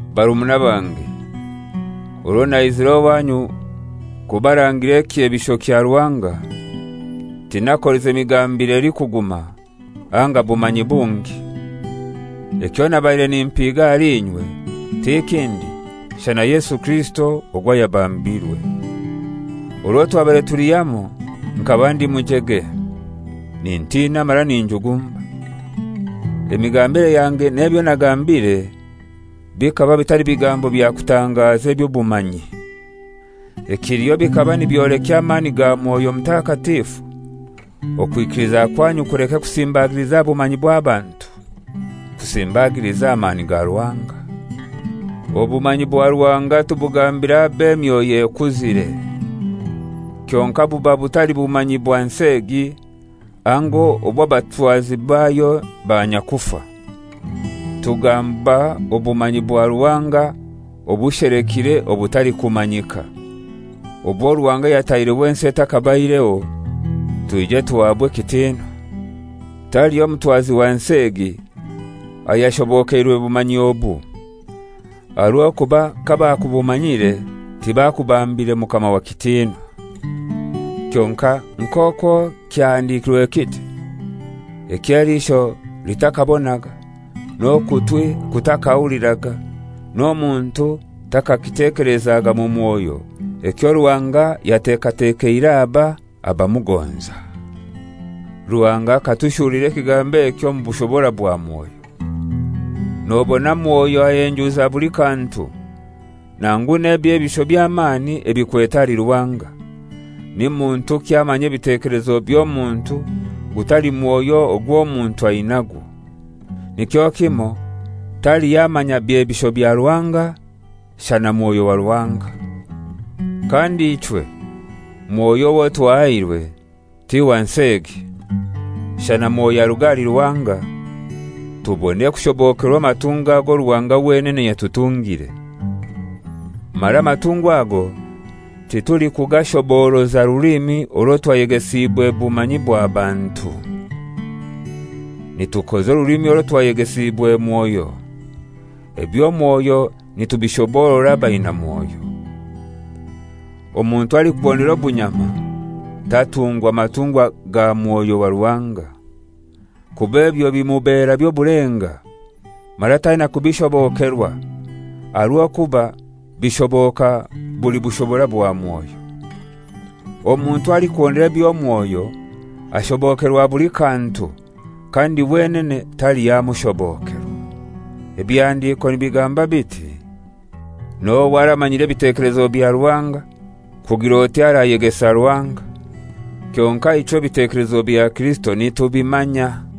Barumuna bange, orwo naizire owanyu kubarangira ekyebisho kya Ruhanga, tinakolize migambire elikuguma anga bumanyi bungi. Ekyo nabaire nimpiga ahali inywe ti kindi shana Yesu Kirisito ogwo ayabambirwe. Orwo twabaire tuli hamoi nkaba ndi mujege, nintina mara ninjugumba. Emigambire yange n'ebyo nagambire bikaba bitali bigambo bya kutangaza eby'obumanyi. Ekiliho bikaba nibyolekya amani ga Mwoyo Mutakatifu, okwikiliza kwanyu kuleke kusimbagiliza aha bumanyi bw'abantu, kusimbagilize aha mani ga Ruhanga. Obumanyi bwa Ruhanga tubugambira ab'emyoyo ekuzire, kyonkai buba butali bumanyi bwa nsi egi anga obw'abatwazi bayo banyakufa. Tugamba obumanyi bwa Ruhanga obushelekire obutalikumanyika, obwo Ruhanga yataireho ensi etakabaireho twije tuhabwe ekitinwa. Taliho mutwazi wa nsi egi ayashobokeirwe bumanyi obu: aha rw'okuba kabakubumanyire tibakubambire Mukama wa kitinwa. Kyonkai nk'owo kyahandikirwe kiti: «Ekyo eliisho litakabonaga, n'okutwi kutakahuliraga, n'omuntu takakitekelezaga mu mwoyo, ekyo Ruhanga yatekatekeire aba abamugonza.» Ruhanga akatushurulira ekigambo eki omu bushobora bwa Mwoyo. Nobona Mwoyo ahenjuza buli kantu, nangu n'eby'ebisho by'amani ebikwete ahali Ruhanga. Ni muntuki amanya ebitekelezo by'omuntu gutali mwoyo ogw'omuntu ainagwo? Nikyo kimoi, taliho amanya byebisho bya Ruhanga, shana Mwoyo wa Ruhanga. Kandi ichwe mwoyo owo twahairwe ti wa nsi egi, shana Mwoyo aruga ahali Ruhanga, tubone kushobokerwa amatungwa ago Ruhanga wenene yatutungire. Mara amatungwa ago titulikugashoboroza rulimi orwo twayegesiibwe bumanyi bwa bantu. Nitukoza orulimi orwo twayegesiibwe Mwoyo, eby'omwoyo nitubishoborora abaina Mwoyo. Omuntu alikuhondera obunyama tatungwa matungwa ga Mwoyo wa Ruhanga, kuba ebyo bimubera by'obulenga, mara taina kubishobokerwa, aha rw'okuba bishoboka buli bushobora bwa Mwoyo. Omuntu alikuhondera eby'omwoyo ashobokerwa buli kantu, kandi wenene taliho amushobokerwa. Ebihandiko nibigamba biti, «N'ohai aramanyire ebitekelezo bya Ruhanga, kugir'oti arayegesa Ruhanga?» Kyonkai ichwe ebitekelezo bya Kirisito nitubimanya.